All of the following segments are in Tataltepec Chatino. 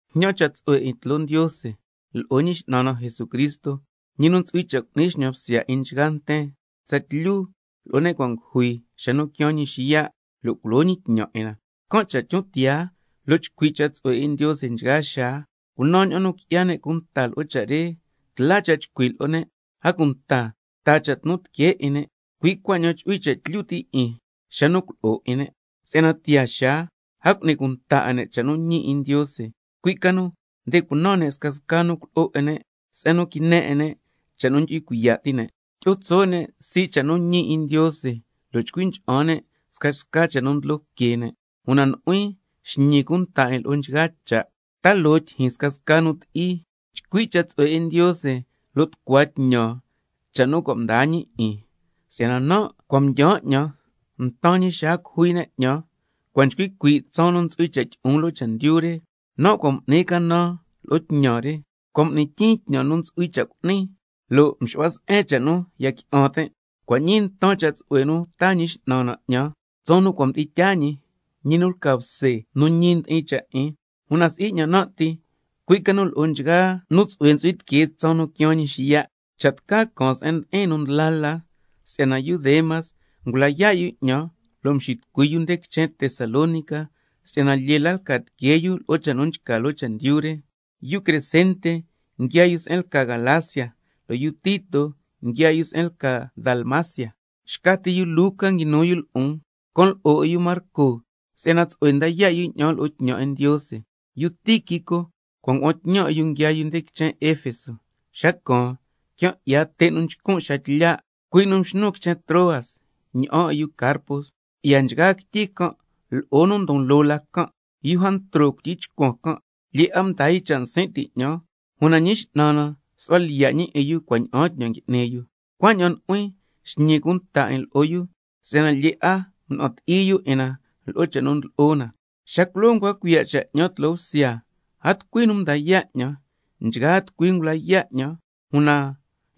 Jñan cha' tsu'hue 'in tloo Ndiose lo'o Ñi X'nan na Jesucristo, ñi nu ntsu'hui cha' cu'ni xñan bsya 'in nchgaa nten tsatlyu lo'o ne' cua' ngujui, xa nu quiaan ñi xiya' lo' culo ñi tñan 'in na. Can' cha' tyon tiyaa lo' chcui' cha' tsu'hue 'in Ndiose nchgaa xaa, cunan ña'an nu qui'ya ne' cunta lo'o cha' re, tla cha' chcui' lo'o ne', a cunta taa cha' tnu tiquee 'in ne', cui' cuaña'an chu'hui cha' tlyu ti' 'in xa nu culo'o 'in ne'. Si'yana tiyaa xaa a cu'ni cunta 'a ne' cha' nu ñi 'in Ndiose, cui' ca nu nde cunan ne' scasca nu culo'o 'in ne', se'en nu quine 'in ne' cha' nu ndu'hui cuiya' ti' ne', tyi'o tso' ne' sii' cha' nu ñi 'in Ndiose, lo' chcui ncha'an ne' scasca cha' nu ndlo que nten. Una nu'huin xñi cunta 'in lo'o nchgaa loo cha', ta loo tyijyin scasca nu ti'i, chcui' cha' tsu'hue 'in Ndiose, lo' tucua tñan ña'an cha' nu cua' mdaa ñi 'in. Si'yana nan' cua' mdyaan 'ñan, ntan ñi xaa cujui ne' 'ñan, cua' nchcui cuii' tsaan nu ntsu'hui cha' tyi'on loo chendyu re. Nan' cua' m'nin canan lo'o tñan re, cua' m'ni tyin tñan nu ntsu'hui cha' cu'nin, lo' mxu'hua se'en cha' nu ya qui'an tin'. Cua' ñii ntan cha' tsu'hue nu taa Ñi X'nan na 'ñan tsaan nu cua' mdi'in tyaa ñi, ñi nu lca bse nu ñi ndi'in cha' 'in, una si'i 'ñan nan' ti, cui' ca nu lo'o nchgaa nu tsu'hue ntsu'hui tiquee nta tsaan nu quiaan ñi xiya'. Cha' tca caan se'en ndi'in nu ndla la, si'yana yu Demas ngula yaa' yu 'ñan lo' mxitucui yu nde quichen Tesalónica, si'yana lyee la lca tiquee yu lo'o cha' nu nchca loo chendyu re. Yu Crescente nguiaa yu se'en lca Galacia, lo' yu Tito nguiaa yu se'en lca Dalmacia, xca ti yu Luca nguinu yu lo'on. Can lo'o 'in yu Marco si'yana tsu'hue nda yaa' yu 'ñan lo'o tñan 'in Ndiose. Yu Tíquico cua' ngua'an tñan 'in yu nguiaa yu quichen Efeso. Xa caan, quian 'ya te' nchcun' xaa tlya', cui' nu mxnun quichen Troas ña'an 'in yu Carpo, cui'ya nchgaa quityi can' lo'o nu ndon loo la can'. Yu Jantro cuityi chcuan can', lyee 'a mdaa yu cha' nsin' ti' 'ñan, una Ñi X'nan na —su'hua lyiya' 'in yu cua' ña'aan tñan m'ni yu—. Cuaña'an nu'huin xñi cunta 'in lo'o yu, si'yana lyee 'a mna'an ti'i yu 'in na lo'o cha' nu ndlo'o na. Xa culoo ncua cuiya' cha' 'ñan tloo bsya, a tucui nu mda yaa' 'ñan, nchgaa tucui ngula yaa' 'ñan, una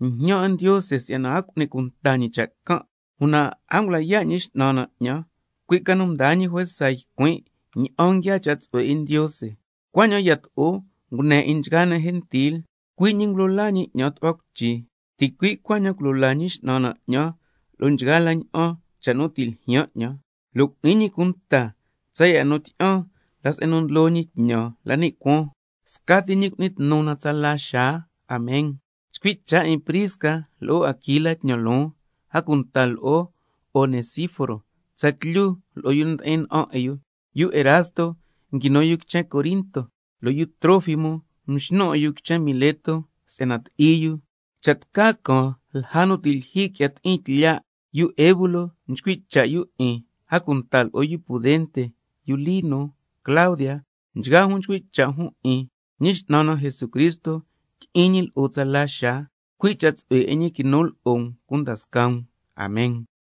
jñan 'in Ndiose si'yana a cu'ni cunta ñi cha' can'. Una a ngula yaa' Ñi X'nan na 'ñan, cui' ca nu mdaa ñi juesa ycuin' ña'an nguiaa cha' tsu'hue 'in Ndiose, cuaña'an yato'o ngune 'in nchgaa ne' gentil. Cui' ñi —ngulo laa ñi 'ñan tu'hua cuichi—, ticui' cuaña'an culo laa Ñi X'nan na 'ñan lo'o nchgaa la ña'an cha' nu ti' ljyaan 'ñan, lo' cu'ni ñi cunta 'ñan tsaya' nu tyi'an la se'en nu ndlo ñi tñan la ni' cuaan, scati ñi cu'ni tnu na tsala xaa. Amen. Chcui' cha' 'in Prisca lo'o Aquila tñan loon, a cunta lo'o Onesíforo tsatlyu lo'o nu ndi'in na'an 'in yu. Yu Erasto nguinu yu quichen Corinto, lo' yu Trófimo mxnun 'in yu quichen Mileto si'yana ti'i yu. Cha' tca caan lja nu ti' lyijyi qui'ya ti'in tlya'. Yu Eubulo nchcui' cha' yu 'in, a cunta lo'o yu Pudente, yu Lino, Claudia, nchgaa jun nchcui' cha' jun 'in. Ñi X'nan na Jesucristo tyi'in ñi lo'o tsala xaa, cui' cha' tsu'hue 'in ñi quinu lo'o um cunda scaa um. Amen.